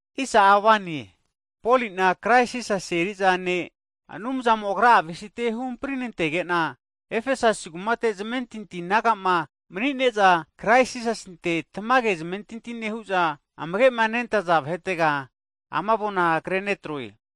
Hagi Poli'na, Krais Jisasi aposolo eri'za ne'mo'na Anumzamo Agra'a avesite huhampri nantenege'na, Efesasi kumate zamentinti nehaza naga'ma (Saints) mani'ne'za, Krais Jisasinte tamage zamentinti nehu'za amage' nentaza vahetega ama avona kre netroe.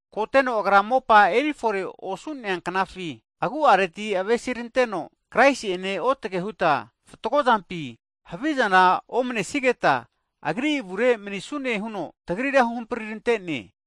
Korapara Agra mopa erifore osu'nea knafi agu'areti avesiranteno, Kraisi'ene otage huta fatgo zampi, havizana omanesigeta Agri avure manisnune huno tagrira huhamprirante'ne.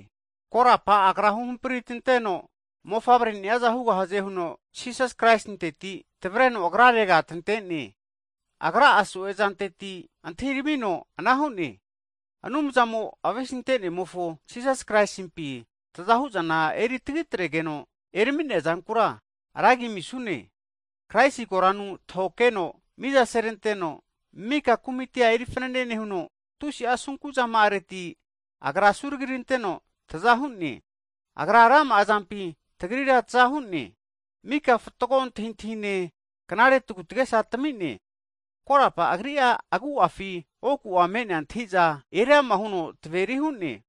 Korapa Agra huhampri tanteno mofavreni'aza hugahaze huno Jisas Kraisinteti, tavreno Agrarega tante'ne, Agra'a so'e zanteti antahiramino anara hu'ne. Anumzamo'a avesinentemofo Jisas Kraisimpi taza hu'zana eri tagitregeno erami'nea zankura, ra agi amisune. Kraisi koranu tahokeheno miza seneranteno, maka kumitia eri fanane nehuno, tusi'a asunku zama'areti Agra asuragiranteno taza hu'ne, Agra rama'a zampi tagrira taza hu'ne. Mika fatgo antahintahine, knare tagu tagesa tami'ne. Korapa Agri'a agu'afi oku'a me'nea antahi'za eriama huno taveri hu'ne.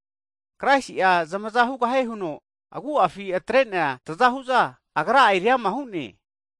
Kraisi'a zamaza hugahie huno agu'afi atre'nea tzahu'za, Agra'a eriama hu'ne.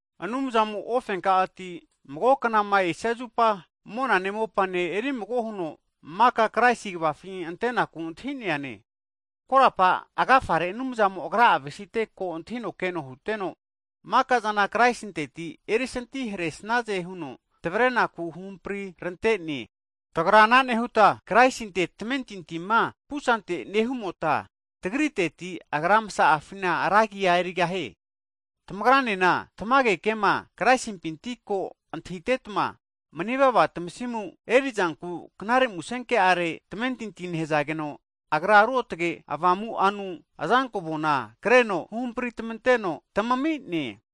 Anumzamo ofenka'ati mago knama esia zupa, monane mopane eri mago huno, maka Kraisi kvafi antenaku antahi'neane, korapa agafare Anumzamo'a Agra'a avesite ko antahino keno huteno, maka'zana Kraisinteti erisanti hare'snaze huno tavarenaku huhampri rante'ne. Tagra ana nehuta, Jiu vahe'mota Kraisinte tamentintima pusante nehumota tagra, Anumzamofona ra agi amigahune. Tamagranena tamage kema Kraisimpinti ko antahitetma, manivava tamasimu eri'zanku Knare Musenke'are tamentintia nehazageno, Agra Ruotge Avamu'anu azanko avona kreno huhampri (seal) tamanteno tamami'ne.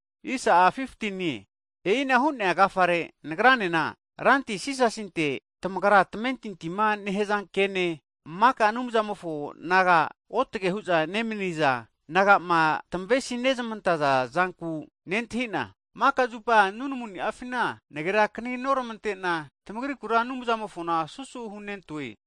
Hagi e'ina hu'nea agafare nagranena, Ranti Jisasinte tamagra tamentintima nehaza ke'ne, maka Anumzamofo naga otge hu'za nemani'za naga'ma tamavesima nezmantaza zanku nentahi'na, maka zupa nunamuni'afina nagerakani noramante'na, tamagrikura Anumzamofona susu hunentoe.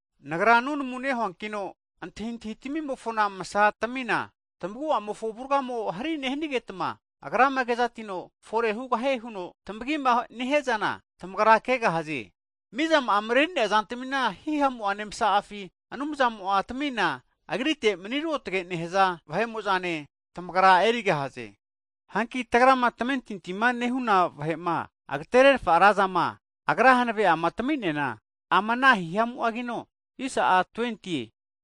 Nagra nunamu nehuankino antahintahitamofona masa tamina, tamagu'amofo avurgamo hari nehanigetma, Agrama kezatino fore hugahie huno tamagima nehiazana, tamagra kegahaze. Mizama'a mareri'nea zantmi, hihamu'ane msazama'afi Anumzamo'a tamina, Agrite mani ruotge nehaza vahe'mo'zane, tamagra erigahaze. Hanki ana nehuta tagrama tamentinti nehuna vahe'ma agatererfa razama, Agra hanave'a tami'neana, ama ana hihamu'agino,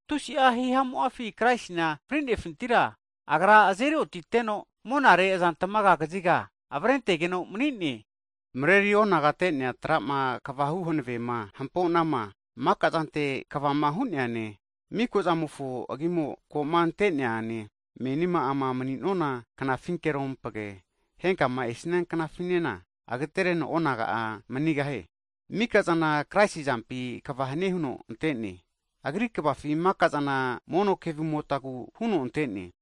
tusi'a hihamu'afi Kraisina fri'nefintira, Agra azeri otiteno monare azantamaga kaziga avare antegeno mani'ne. Mareri onagate'nea tra'ma kvahu hanavema, maka zante kvama hu'neane, mika zamofo agima ko'ma antemi'neane, menima ama mani'nona knafinkerompage, henkama esia knafinena agatereno onaga'a mani'ne. Maka'zana Kraisi azampi kva hanie huno ante'ne, Agri kvafi maka'zana mono kevumotagu (sios) huno ante'ne.